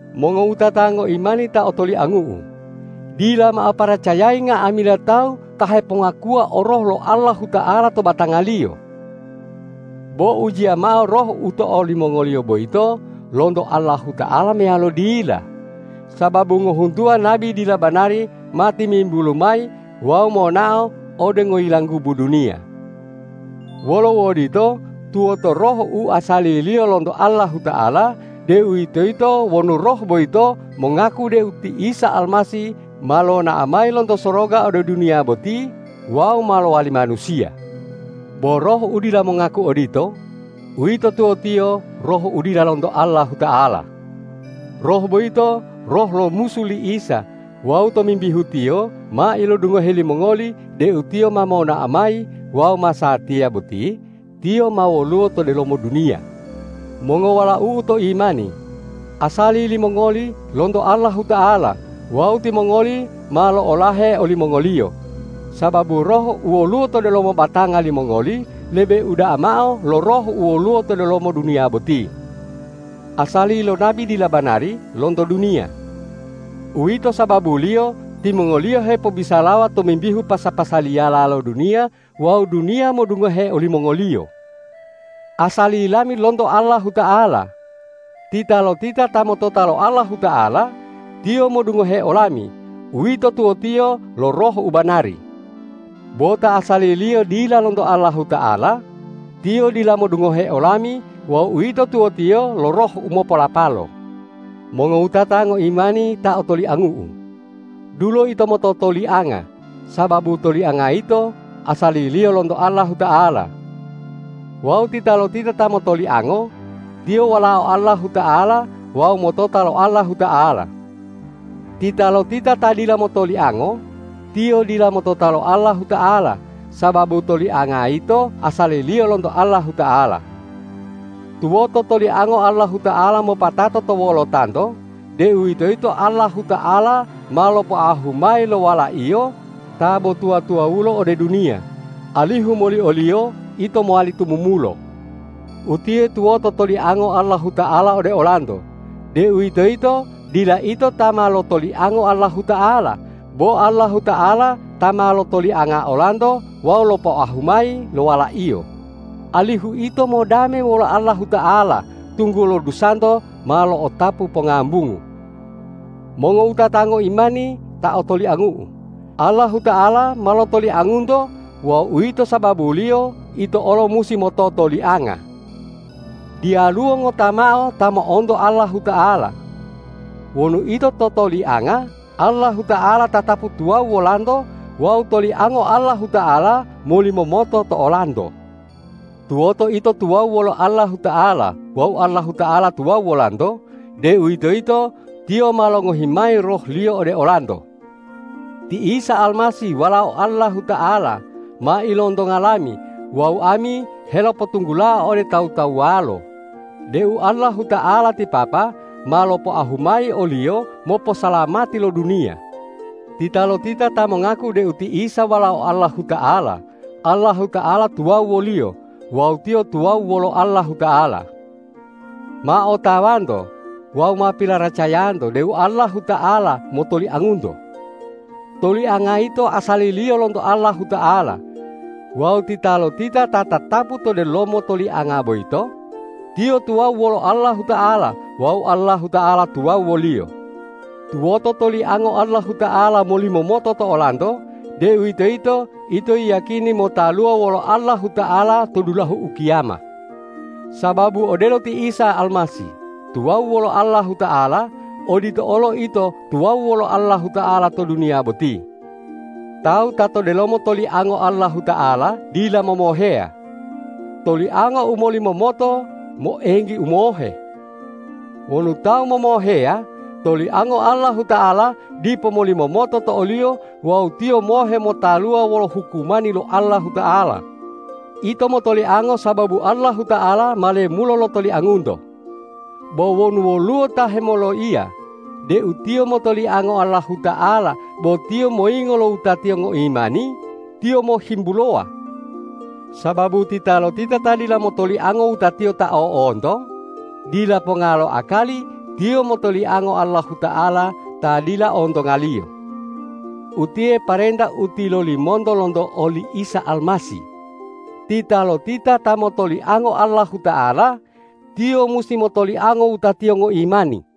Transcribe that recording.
Mongowutata ngoimani ta otoliangu'u, dila mao paracayayi nga'amila tawu ta hepongakuwa o Roh lo Allahuta'ala to batangaliyo. Bo ujiya mao roh u to olimongoliyo boyito lonto Allahuta'ala meyalo dila, sababu ngohuntuwa nabi dila banari ma timimbulu mayi wawu monao ode ngoyilanggubu duniya. Wolo uodito, tuwoto Roh u asaliliyo lonto Allahuta'ala, deuwitoyito wonu roh boyito mongaku deu ti Isa Almasih ma lonao mayi lonto soroga ode duniya boti wawu ma lowali manusiya. Bo roh u dila mongaku odito, uwito tuwotiyo roh u dila lonto Allahuta'ala. Roh boyito roh lo musu li Isa wawu tomimbihu tiyo ma ilodungohe limongoli deu tiyo ma monao mayi wawu masatiya boti tiyo ma woluwo to delomo duniya. Mongowalau'u to imani, asali limongoli lonto Allahuta'ala wawu timongoli ma lo'olahe olimongoliyo, sababu Roh u woluwo to delomo batanga limongoli lebe uda'a mao lo roh u woluwo to delomo duniya boti. Asali lo nabi dila banari lonto duniya. Uwito sababuliyo timongoliyo hepobisalawa tomimbihu pasa-pasaliyala lo duniya wawu duniya modungohe olimongoliyo. Asali lami lonto Allahuta'ala. Titalotita ta motota lo Allahuta'ala, tiyo modungohe olami; uwito tuwotiyo lo Roh u banari. Bo ta asaliliyo dila lonto Allahuta'ala, tiyo dila modungohe olami wawu uwito tuwotiyo lo roh u mopolapalo. Mongowutata ngoimani ta otoliangu'u, dulo ito mototolianga, sababu tolianga yito asaliliyo lonto Allahuta'ala. Wawu titalotita ta motoliango, tiyo walao Allahuta'ala wawu motota lo Allahuta'ala. Titalotita ta dila motoliango, tiyo dila motota lo Allahuta'ala, sababu tolianga yito asaliliyo lonto Allahuta'ala. Tuwoto toliango Allahuta'ala mopatato to wolotanto, deuwitoyito Allahuta'ala ma lopoahu mayi lo Wala-Iyo ta bo tuwa-tuwawulo ode duniya, alihu moli o-Liyo ito mowali tumumulo. Utiye tuwoto toliango Allahuta'ala ode olanto, deuwitoyito dila ito ta ma lotoliango Allahuta'ala, bo Allahuta'ala ta ma lotolianga olanto wawu lopoahu mayi lo Wala-Iyo, alihu ito modame wolo Allahuta'ala, tunggulo dusanto ma lo'otapu pongambungu. Mongowutata ngoimani ta otoliangu'u, Allahuta'ala ma lotoliangunto wawu uwito sababuliyo ito olo musi mototolianga. Diyaluwo ngota mao ta mo'onto Allahuta'ala. Wonu ito totolianga, Allahuta'ala tatapu tuwawu wolanto wawu toliango Allahuta'ala molimomoto to olanto. Tuwoto ito tuwawu wolo Allahuta'ala wawu Allahuta'ala tuwawu wolanto, deuwitoyito Tiyo ma longohi mayi Roh-Liyo ode olanto. Ti Isa Almasih Walao Allahuta'ala ma ilontonga lami wawu ami helopotunggulao ode tawu-tawuwalo deu Allahuta'ala ti Papa ma lopoahu mayi o-Liyo moposalamati lo duniya. Titalotita ta mongaku deu ti Isa Walao Allahuta'ala, Allahuta'ala tuwawu woliyo wawu tiyo tuwawu wolo Allahuta'ala. Ma otawanto wawu ma pilaracayanto deu Allahuta'ala motoliangunto. Tolianga yito asaliliyo lonto Allahuta'ala. Wawu titalotita ta tatapu to delomo tolianga boyito, tiyo tuwawu wolo Allahuta'ala wawu Allahuta'ala tuwawu woliyo. Tuwoto toliango Allahuta'ala molimomoto to olanto, deuwitoyito ito yiyakini motaluwa wolo Allahuta'ala to dulahu ukiyama. Sababu odelo ti Isa Almasih tuwawu wolo Allahuta'ala, odito olo ito tuwawu wolo Allahuta'ala to duniya boti. Tawu ta to delomo toliango Allahuta'ala dila momoheya. Tolianga u molimomoto moenggi umohe. Wonu tawu momoheya, toliango Allahuta'ala dipo molimomoto to oliyo wawu tiyo mohe motaluwa wolo hukumani lo Allahuta'ala. Ito motoliango sababu Allahuta'ala ma lemulo lotoliangunto. Bo wonu woluwo ta hemoloiya deu tiyo motoliango Allahuta'ala bo tiyo moyingo lo wutatiyo ngoimani, tiyo mohimbulowa. Sababu titalotita ta dila motoliango wutatiyo ta o'onto, dila ponga lo akali tiyo motoliango Allahuta'ala ta dila ontongaliyo. Utiye parenta u tilolimonto lonto oli Isa Almasih: Titalotita ta motoliango Allahuta'ala, tiyo musi motoliango wutatiyo ngoimani.